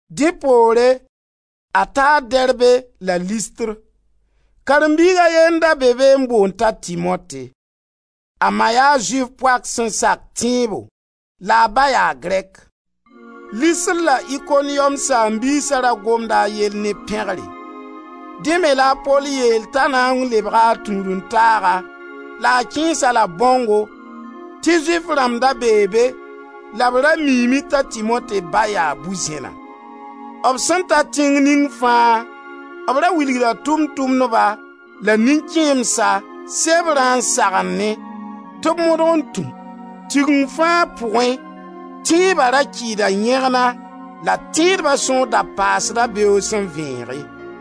Dẽ poore a taa Derbe la Listr. Karen-biig a ye n da be be n boond t'a Timote. A ma yaa Zʋɩf poak sẽn sak tẽebo la a ba yaa Grɛk. Listr la Ikoniyom saam-biisa ra gomda a yell ne pẽgre. Dẽ me la a Pol yeel t'a na n lebga a tũud-n-taaga la a kẽes-a-la bãongo tɩ Zʋɩf rãmb da bee be la b ra miime t'a Timote ba yaa bu-zẽna. B sẽn ta tẽng ning fãa b ra wilgda Tʋʋm-tʋmdba la nin-kẽemsa sebrã n sagennẽ tɩ b modg n tũ. Tigeng fãa pʋgẽ tẽeba ra kɩɩda yẽgna la tẽedba sõor da paasda beoog sẽn vẽege.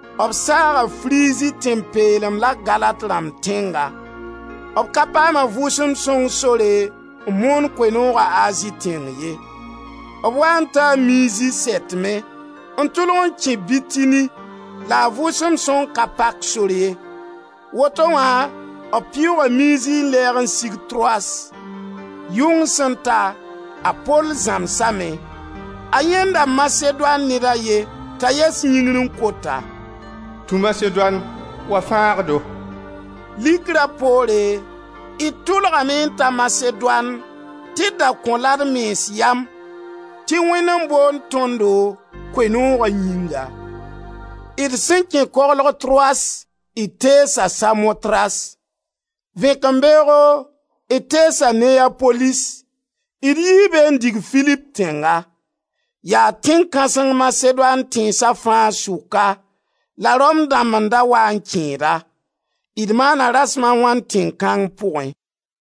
B saaga Frizi tẽn-peelem la Galat rãmb tẽnga. B ka paam a Vʋʋsem Sõng sore n moon Koe-nooga Azi tẽng ye. B waa n taa Mizi sɛtmẽ, n tʋlg n kẽ Bitini la a Vʋʋsem Sõng ka pak sor ye. Woto wã b pɩʋʋga Mizi n lɛɛg n sig Troas. Yʋng sẽn ta, a Pol zãmsame. A yãenda Masedoan ned a ye, t'a yɛs yĩngr n kot-a: «Tũ Masedoan, wa fãag-do!» Likra poore, d tʋlgame n ta Masedoan, tɩ d da kõ-la d mens yam tɩ Wẽnd n boond tõndo Koe-nooga yĩnga. D sẽn kẽ koglg Troas d teesa Samotras. Vẽkembeoogo d teesa Neyapolis, d yii be n dig Filip tẽnga. Yaa tẽn kãseng Masedoan tẽnsa fãa sʋka la Rom dãmb n da waa n kẽed-a. D maana rasem a wãn tẽn kãng pʋgẽ,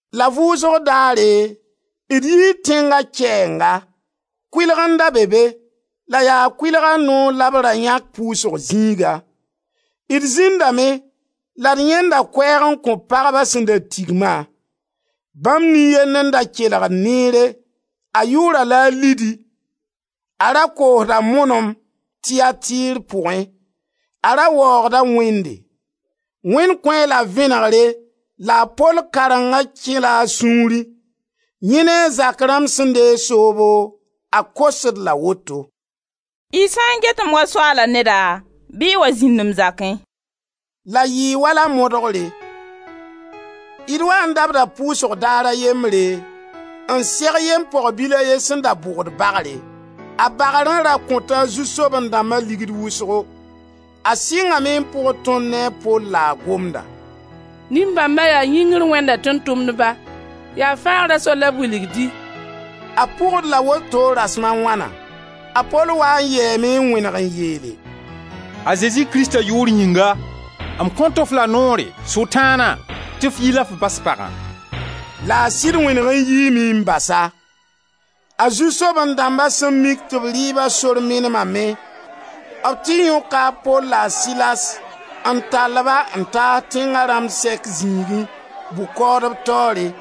la vʋʋsg daare d yii tẽnga kɛɛnga; kʋɩlg n da be be, la yaa kʋɩlga noor la b ra yãk pʋʋsg zĩiga. D zĩndame la d yãenda koɛɛg n kõ pagba sẽn da tigma. Bãmb nin-yend n da kelgd neere: a yʋʋra la a Lidi, a ra koosda monom Tiyatir pʋgẽ, a ra waoogda Wẽnde; Wẽnd kõ-a-la vẽenegre la a Pol karengã kɛla a sũurẽ. Yẽ ne a zak rãmb sẽn deeg soobo, a kos-d la woto: «Y sã n get-m wa Soaala neda, bɩ y wa zĩnd m zakẽ,» la yɩɩ wala modgre. D waa n dabda pʋʋsg daar a yembre, n seg yem-pog-bil a ye sẽn da bʋgd bagre. A bãgra ra kõta a zu-soaben-dãmba ligd wʋsgo. A Sɩngame n pʋgd tõnd ne a Pol la a gomda: «Nin-bãmba yaa Yĩngr Wẽnda tʋʋm-tʋmdba, yaa fãagra sor la b wilgd-y.» A pʋg-d la woto rasem a wãna. A Pol waa n yɛɛme n wẽneg n yeele: «A Zezi Krista yʋʋr yĩnga, m kõt-f la noore, Sʋtãana, tɩ f yi la f bas pagã.» La a sɩd wẽneg n yiime n bas-a. A zu-soaben-dãmba sẽn mik tɩ b rɩɩba sor menemame, b tɩ yõka a Pol la a Silas n tall-ba n taas tẽnga rãmb sɛk zĩigẽ, bʋ-kaoodb taoore.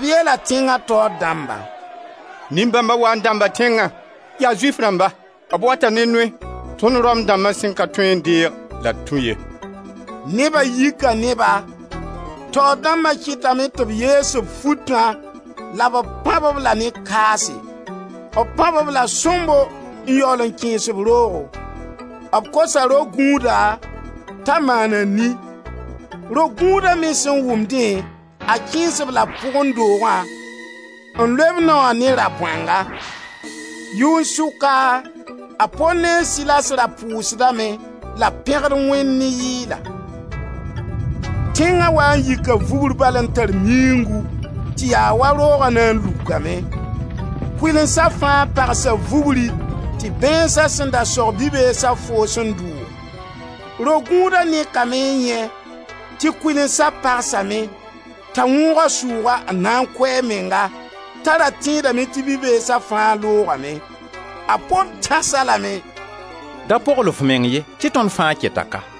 B yeela tẽnga taoor dãmba: «Nin-bãmba waa n dãmbda tẽngã, yaa Zʋɩf rãmba. B wata ne noe tõnd Rom dãmba sẽn ka tõe n deeg la d tũ ye.» Neba yika ne-ba. Taoor dãmba kɩtame tɩ b yees b futã la b pãb-b-la ne kaase. B Pãb-b la sõmbo n yaool n kẽes-b roogo. B kosa ro-gũudã t'a maan a ni. Ro-gũuda me sẽn wʋm dẽ, a kẽes-b la pʋgẽ doogã n loe b nao wã ne rabõanga. Yʋn-sʋka, a Pol ne a Silas ra pʋʋsdame la b pẽgd Wẽnd ne yɩɩla. Tẽnga waa n yika vugr bal n tar miuungu tɩ ya wa rooga na n lukame. Kʋɩlensa fãa pagsa vugri tɩ bãeensa sẽn da sog bi-beesa foos n dʋʋg. Ro-gũuda nekame n yãe tɩ kʋɩlensa pagsame t'a wõog a sʋʋga n na n kʋ a menga t'a ra tẽedame tɩ bi-beesa fãa loogame. A Pol tãs-a lame: «Da pogl f meng ye tɩ tõnd fãa keta ka.»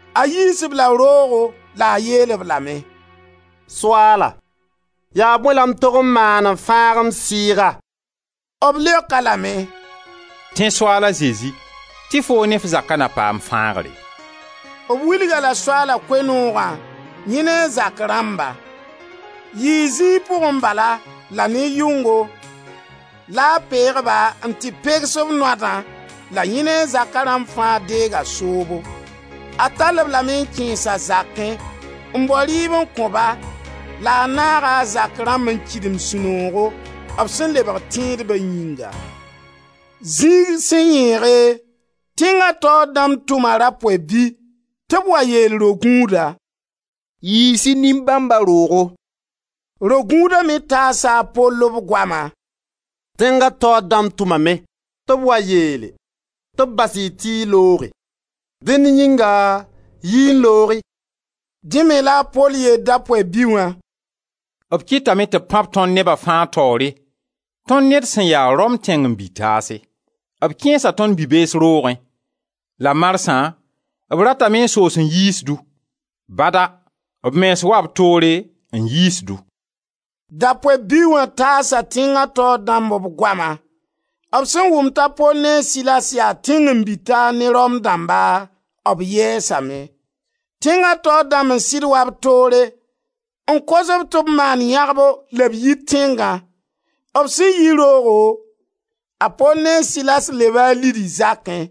A yiis-b la roogo la a yeel-b lame: «Soaala, yaa bõe la m tog n maan n fãag m sɩɩga?» B leok-a lame: «Tẽ Soaal a Zezi tɩ foo ne f zaka na paam fãagre.» B wilg-a-la Soaala Koe-noogã, yẽ ne a zak rãmba. Yɩɩ zĩig pʋgẽ bala la ne yʋngo la a peeg-ba n tɩ peks b noadã la yẽ ne a zaka rãmb fãa deega soobo. A tall-b lame n kẽes a zakẽ, n bao rɩɩb n kõ-ba la a naaga a zak rãmb n kɩdem sũ-noogo, b sẽn lebg tẽedba yĩnga. Zĩig sẽn yẽege, tẽnga taoor dãmb tʋma rapoy-bi tɩ b wa yeel ro-gũuda: «Yiis-y nin-bãmba roogo.» Ro-gũuda me taasa a Pol b goama: «Tẽnga taoor dãmb tʋmame tɩ b wa yeel tɩ b bas-y tɩ y looge. Dẽnd yĩnga yi-y n loog-y.» Dẽ me la a Pol yeel Dapoy-bi wã: «B kɩtame tɩ b pãb tõnd neba fãa taoore, tõnd ne d sẽn ya Rom tẽngen-bi-taase; b kẽesa tõnd bi-bees roogẽ. La marsã b ratame n soos n yiis-du! Bada! B mens wa b toore n yiis-du.» Dapoy-bi wã taasa tẽnga taoor dãmb b goama. B sẽn wʋm t'a Pol ne a Silas yaa tẽngen-bi-taar ne Rom dãmba, b yɛɛsame. Tẽnga taoor dãmb n sɩd wa b toore n kos-b tɩ b maan yãgbo la b yi tẽngã. B sẽn yi roogo a Pol ne a Silas leba a Lidi zakẽ.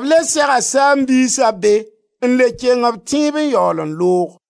B le sega saam-biisa be n le keng b tẽeb n yaool n loog.